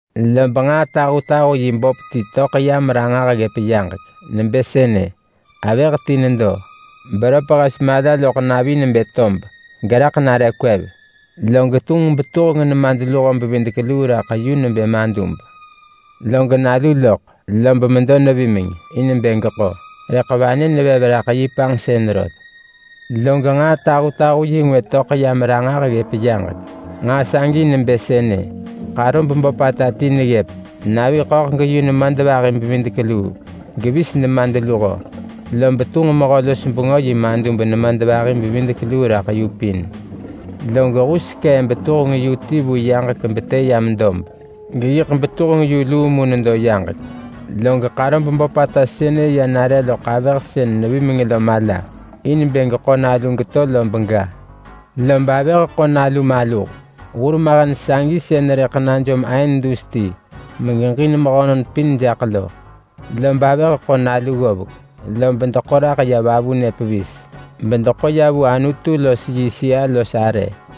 Lob nġaa tahutahu-yi böp ti töḳ yam ranġah ggëp yaġek, nebë sënë: Avëh ti nedo, beröp hes mala loḳ navi nebë tob geraḳ nare kwev. Log tunġ betuheng nemadluho-bevidek-luu raḳ yu nebë madub. Log nalu loḳ, lob medo nevimeng in bë geko, rëḳ vanë nevev raḳ yi panġsën rot. Log nġaa tahutahu-yi ngwë töḳ yam ranġah ggëp yaġek. Nġaa sagi nebë sënë: Ḳarob böpata ti neggëp. Navi ḳöḳ geyu nemadvahi-bevidek-luu, gevis nemadluho. Lob tunġ mehö-los-bengö yi madub nemadvahi-bevidek-luu raḳ yu pin. Log hus sekee betuheng yu ti vu yaġek betë yam dob. Geyiḳ betuheng yu luu mu nedo yaġek. Log ḳarob böpata sënë ya nare loḳ avëh sën nevimeng lo mala, in bë geḳo nalu geto lob ga. Lob avëh ḳo nalu maluh. Hur mahen sagi sën rëḳ najom aën dus ti megeġin mehönon pin jaḳ lo. Lob avëh ḳo nalu ggovek, lob deḳo raḳ ya vavunë pevis, bedeḳo ya vu Anutu los yi sëa-los-arë,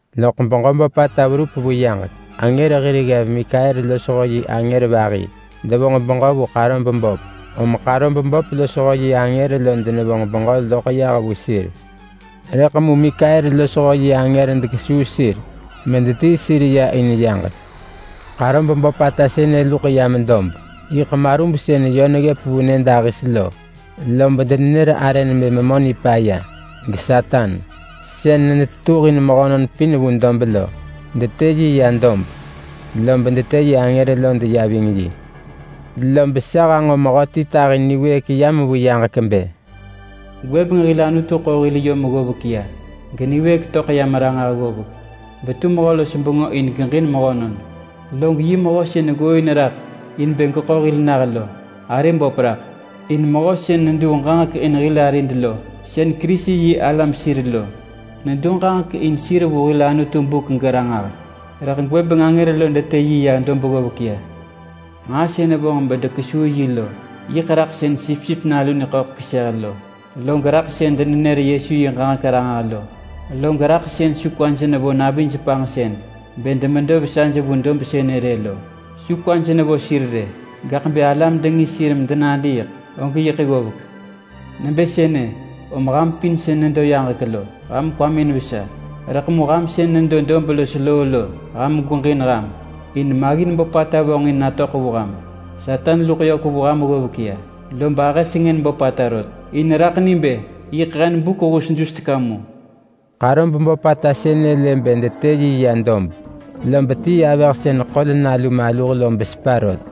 Loḳ beġö böpata verup vu yaġek. Angër hir ggev Mikael losho yi angër vahi devonġ beġö vu ḳarob böp, om ḳarob böp losho yi angër lo denevonġ beġö loḳ yah vu sir. Rëḳ mu Mikael losho yi angër dekesuu sir medetii sir ya in yaġek. Ḳarob böpata sënë luḳ yam dob, yiḳ marub sën yö neggëp vu nyëdahis lo lob denenër arë nebë Memö Nipaya, geSatan. Sën netetuhin mehönon pin vu dob lo. Detë yi ya dob lob detë yi angër lo ya ving yi. Lob sa hanġo mehöti tahi niwëëk yam vu yaġek bë: “Gwëbeng hil Anutu ḳo hil yom ggovek ya, geniwëëk töḳ yam ranġah ggovek betu mehö-los-bengö in geġin mehönon! Log yi mehö sën ggooin raḳ in bë geḳo hil nah lo arë böp raḳ! In mehö sën nenër ġaġek raḳ hil arid lo sën Kerisi-yi-alam sir lo, nenër ġaġek raḳ sir vu hil Anutu buk geranġah. Rëḳ gwëbeng angër lo detë yi ya dob ggovek ya. Nġaa sën vonġ bedekesuu yi lo yiḳ raḳ sën Sipsip Nalu niḳöḳ keseh lo, log raḳ sën denenër Yesu yi ġaġek ranġah lo, log raḳ sën su kwaj nevo navij panġsën bë demedo nivesa vu dob sënë rë lo. Su kwaj nevo sir rë, gaḳ bë alam dengis sir medenadiiḳ og yiḳ ggovek. Nebë sënë om ham pin sën nedo yaġek lo, ham kwamin vesa! Rëḳ mu ham sën nedo dob los loo lo, ham gweġin ham! In maggin böpata vonġin natöḳ vu ham. Satan luḳ yök vu ham ggovek ya, lob ahë sengën böpata rot, in raḳ ni bë yiḳ hen buk hus dus teka mu.” Ḳarob böpata sënë lë bë detë yi ya dob, lob tii avëh sën ḳol nalu maluh lo besepa rot.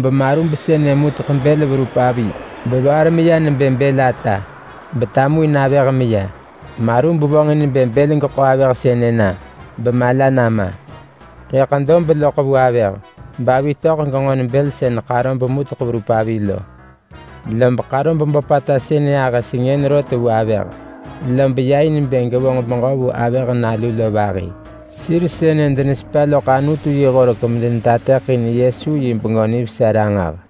Lob marub sënë muteḳ bël verup avi bevaar meya nebë bël ata betamuin avëh meya. Marub vonġin bë bël geḳo avëh sënë na bemala nama. Rëḳ dob loḳ vu avëh bavi töḳ genġon bël sën ḳarob muteḳ verup avi lo. Lob ḳarob böpata sënë ahë sengën rot vu avëh, lob ya in bë gevonġ beġö vu avëh nalu lo vahi. Sir sënë denesepa loḳ Anutu yi horek medenetateḳin Yesu yi Bengö Nivesa ranġah.